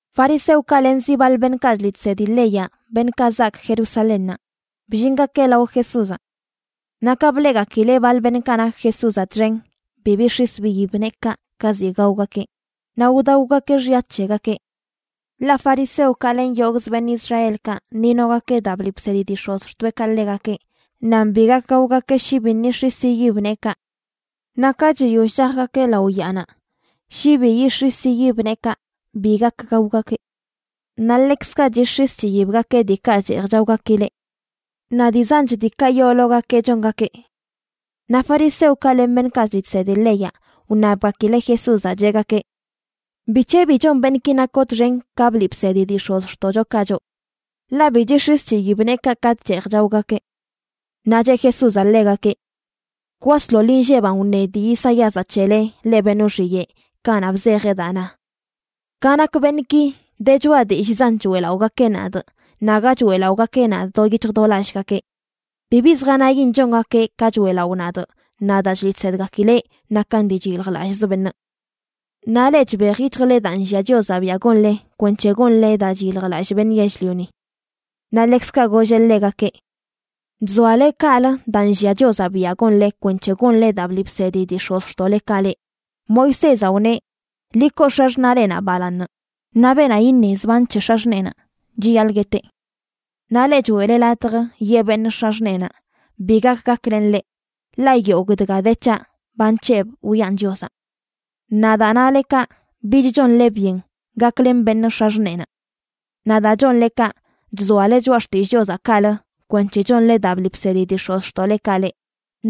Fariseokaꞌ len zi baḻ beṉꞌkaꞌ chliꞌ chsedi leyaꞌ, beṉꞌkaꞌ zaak Jerusalénnaꞌ, bllingakeꞌ lao Jesúzaꞌ. Naꞌ ka bleꞌgakileꞌ baḻ beṉꞌkaꞌ nak Jesúzaꞌ txen bi bix̱is biyib neekaꞌ ka ziꞌ gaogakeꞌ, naꞌ wdaogakeꞌ xya c̱hegakeꞌ. (Ḻaꞌ fariseokaꞌ len yogꞌz beṉꞌ Israelkaꞌ ni nogakeꞌ daa bliꞌ bsedi dii x̱ozxtoeꞌkaꞌ ḻegakeꞌ nan bi gak gaogakeꞌ shi biṉꞌ yix̱is yiyib neekaꞌ. Naꞌ ka chiyoll chajgakeꞌ lao yaanaꞌ shi bi yix̱is yiyib neekaꞌ bi gak gaogakeꞌ. Naꞌ ḻekzkaꞌ chix̱is chiyibgakeꞌ diikaꞌ cheej chaogakileꞌ. Naꞌ dii zanch diikaꞌ yoologakeꞌ chongakeꞌ.) Naꞌ fariseokaꞌ len beṉꞌkaꞌ chliꞌ chsedi leyaꞌ wṉabgakileꞌ Jesúzaꞌ, cheꞌgakeꞌ: ―¿Bic̱he bi chon beṉꞌki nakoꞌ txen ka bliꞌ bsedi dii x̱ozxtoꞌchokaꞌ choꞌ?, ḻaꞌ bi chix̱is chiyib neekaꞌ katꞌ cheej chaogakeꞌ. Naꞌ cheꞌ Jesúzaꞌ ḻegakeꞌ: ―Kwasḻoḻ inlleban wṉe dii Isaíazaꞌ c̱hele, leꞌ beṉꞌ wxiyeꞌ, kanaꞌ bzejeꞌ daa na: Ka nak beṉꞌki, de choꞌa dillꞌzan choeꞌlaꞌogakeꞌ nadꞌ, naꞌ aga choeꞌlaꞌogakeꞌ nadꞌ do yic̱hj do lallꞌgakeꞌ. Bibi zjanayin chongakeꞌ ka choeꞌlaꞌo nadꞌ; naꞌ daa chliꞌ chsedgakileꞌ nakan dii chyiljlallꞌz beṉꞌ. Naꞌ leꞌ chbej yic̱hjle daa nllia Chiozaꞌ biaꞌ gonle kwenc̱he gonle daa chyiljlallꞌ beṉꞌ yell-lioni. Naꞌ ḻekzkaꞌ golleꞌ ḻegakeꞌ: ―Chzoale kaꞌlə daa nllia Chiozaꞌ biaꞌ gonle kwenc̱he gonle daa bliꞌ bsedi dii x̱ozxtoꞌlekaꞌ leꞌ. Moisézaꞌ wneꞌ: “Ḻi koo x̱axṉaꞌlenaꞌ balaaṉ”, naꞌ “Beenaꞌ iṉe zban c̱he x̱axṉeenaꞌ chiyaḻꞌ gueteꞌ.” Naꞌ leꞌ choeꞌle latj yee beṉꞌ x̱axṉeenaꞌ: “Bi gak gaklenꞌ leꞌ, ḻaꞌ yogꞌ dga de c̱haꞌ ba nc̱hebꞌ wiꞌan Chiozaꞌ.” Naꞌ daa nale kaꞌ, bich chonle byen gaklen beṉꞌ x̱axṉeenaꞌ. Naꞌ daa chonle kaꞌ, chzoale choꞌa xtillꞌ Chiozaꞌ kaꞌlə kwenc̱he chonle daa bliꞌ bsedi dii x̱ozxtoꞌlekaꞌ leꞌ.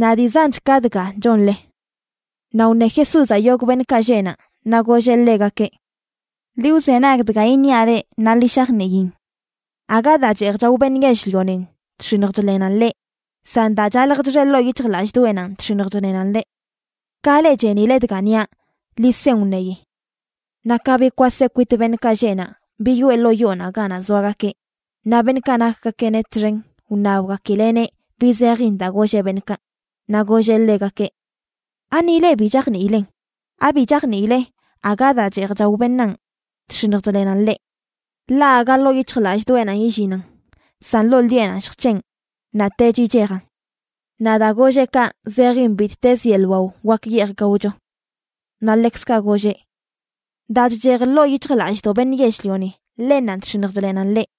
Naꞌ dii zanch ka dga chonle. Naꞌ wṉe Jesúzaꞌ yogꞌ beṉꞌkaꞌ lleꞌ naꞌ, naꞌ golleꞌ ḻegakeꞌ: ―Ḻi wzenag dga iṉiaꞌ leꞌ, naꞌ ḻi shajniin: Aga daa cheej chao beṉꞌ yell-lionin chx̱iṉj chḻenan ḻeꞌ. San daa chalj chxe ḻoo yic̱hjlallꞌdoꞌenanꞌ chx̱iṉj chḻenan ḻeꞌ. Ka leꞌ chenile dga niaꞌ, ḻi sen wṉeyi. Naꞌ ka bikwaseꞌ kwit beṉꞌkaꞌ lleꞌ naꞌ biyoꞌe ḻoo yoonaꞌ ganaꞌ zoagakeꞌ, naꞌ beṉꞌkaꞌ nakgakeꞌneꞌ txen wṉabgakileꞌneꞌ bi zejin daa golleꞌ beṉꞌkaꞌ. Naꞌ golleꞌ ḻegakeꞌ: ―¿Ani leꞌ bi chajniilen? ¿Abi chajniile aga daa cheej chao beṉaan chx̱iṉj chḻenan ḻeꞌ? Ḻaꞌ aga ḻoo yic̱hjlallꞌdoꞌenanꞌ illinan, san ḻoo ḻiꞌenanꞌ lljc̱heꞌn, naꞌtech yichejan. Naꞌ daa golleꞌ kaꞌ, zejin bittezə yeḻꞌ wao wak yeej gaocho. Naꞌ ḻekzkaꞌ golleꞌ: ―Daa chchej ḻoo yic̱hjlallꞌdoꞌ beṉꞌ yell-lioni, ḻennanꞌ chx̱iṉj chḻenan ḻeꞌ.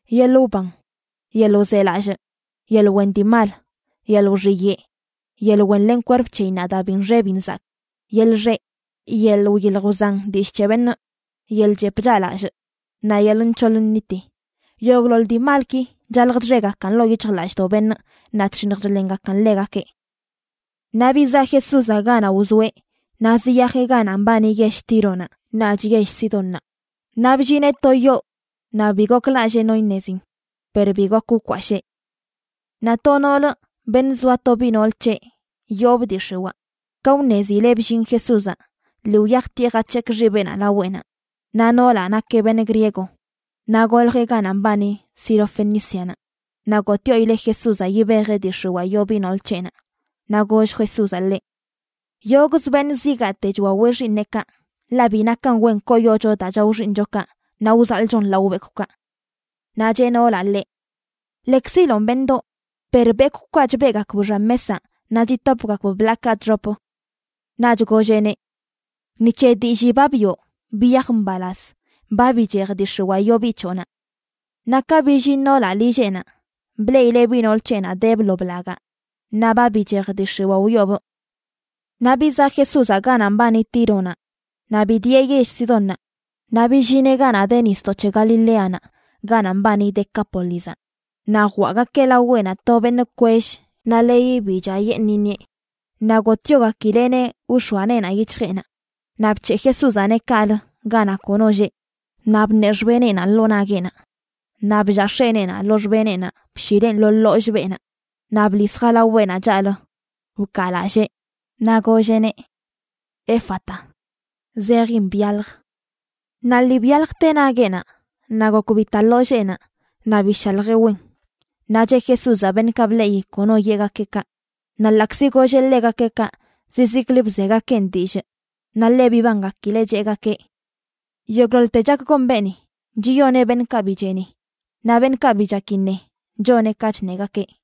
yeḻꞌ wban, yeḻꞌ wzelallꞌ, yeḻꞌ wen dii mal, yeḻꞌ wxiyeꞌ, yeḻꞌ wenlen kwerp c̱heyinnaꞌ daa bi nxe bi nzakꞌ, yeḻꞌ xeꞌ, yeḻꞌ wyilj wzan dillꞌ c̱he beṉꞌ, yeḻꞌ chep chaꞌlallꞌ, naꞌ yeḻꞌ nc̱hoḻ nniti. Yogꞌḻoḻ dii malki chalj chxegakan ḻoo yic̱hjlallꞌdoꞌ beṉꞌ naꞌ chx̱iṉj chḻengakan ḻegakeꞌ. Naꞌ bizaꞌ Jesúzaꞌ ganaꞌ wzoeꞌ naꞌ ziyajeꞌ ganaꞌ mbani yell Tíronaꞌ naꞌch yell Sidónnaꞌ. Naꞌ bllineꞌ to yoo naꞌ bi goklallee no iṉezin, per bi gok wkwashee. Naꞌ to noolə, beṉꞌ zoa to biꞌ nool c̱heꞌ yoobꞌ dii x̱iwaa, ka wṉezileꞌ bllin Jesúzaꞌ, lii wyajtieꞌ jac̱hekꞌ xibeꞌnaꞌ laweꞌnaꞌ. Naꞌ noolaꞌ nakeꞌ beṉꞌ griego, naꞌ goljeꞌ ganaꞌ mbani Sirofenícianaꞌ. Naꞌ gotꞌyoileꞌ Jesúzaꞌ yibejeꞌ dii x̱iwaa yoo biꞌ nool c̱heꞌnaꞌ. Naꞌ goll Jesúzaꞌ ḻeꞌ: ―Yogꞌzə beṉꞌ zigaate chwaweꞌ xiiṉeꞌkaꞌ. Ḻaꞌ bi nakan wen koyocho daa chao xiiṉchokaꞌ naꞌ wzaḻꞌchon lao bekwꞌkaꞌ. Naꞌ cheꞌ noolaꞌ ḻeꞌ: ―Lekziloꞌn, beṉꞌdoꞌ, per bekwꞌkaꞌ chbeꞌgakb xan mesaꞌ naꞌ chitopgakb bḻaakaꞌ chxop. Naꞌch golleꞌneꞌ: ―Ni c̱he dillii ba biꞌo, biyaj mbalaz. Ba bichej dii x̱iwaa yoo biꞌ c̱hoꞌnaꞌ. Naꞌ ka billin noolaꞌ lilleꞌnaꞌ, bleꞌileꞌ biꞌ nool c̱heꞌnaꞌ debꞌ lo blagaꞌ naꞌ ba bichej dii x̱iwaa wyoobꞌ. Naꞌ bizaꞌ Jesúzaꞌ ganaꞌ mbani Tíronaꞌ naꞌ bidieꞌ yell Sidónnaꞌ naꞌ billineꞌ ganaꞌ de nisdoꞌ c̱he Galileanaꞌ, ganaꞌ mbani Decápolizaꞌ. Naꞌ jwaꞌgakeꞌ laweꞌnaꞌ to beṉꞌ kwell naꞌ leyi bi chaꞌyeṉꞌ iṉieꞌ, naꞌ gotꞌyogakileꞌneꞌ wx̱oa neenaꞌ yic̱hjeꞌnaꞌ. Naꞌ bc̱heꞌ Jesúzaꞌneꞌ kaꞌlə ganaꞌ kono lleꞌ, naꞌ bṉeꞌ xbeneꞌnaꞌ ḻoo nagueꞌnaꞌ, naꞌ bllaa x̱eneenaꞌ lo xbeneꞌnaꞌ, bshileꞌn lo ḻollꞌ beenaꞌ. Naꞌ bḻis jalaweꞌnaꞌ chaꞌlə, wkaalallee, naꞌ golleꞌneꞌ: ―¡Éfata! ―zejin: ¡Byalj! Naꞌ lii byaljte nagueꞌnaꞌ, naꞌ gok bita ḻolleenaꞌ naꞌ bishaljeꞌ wen. Naꞌ cheꞌ Jesúzaꞌ beṉꞌkaꞌ bleꞌi kono yeꞌgakeꞌ kaꞌ. Naꞌ ḻaꞌkzi golleꞌ ḻegakeꞌ kaꞌ, zizikli bzegakeꞌn dillꞌ. Naꞌ ḻe bibangakileꞌ, cheꞌgakeꞌ: ―Yogꞌḻoḻte chak gon beeni, chiyoneꞌ beṉꞌkaꞌ bi cheni, naꞌ beṉꞌkaꞌ bi chak iṉe, choneꞌ ka chṉegakeꞌ.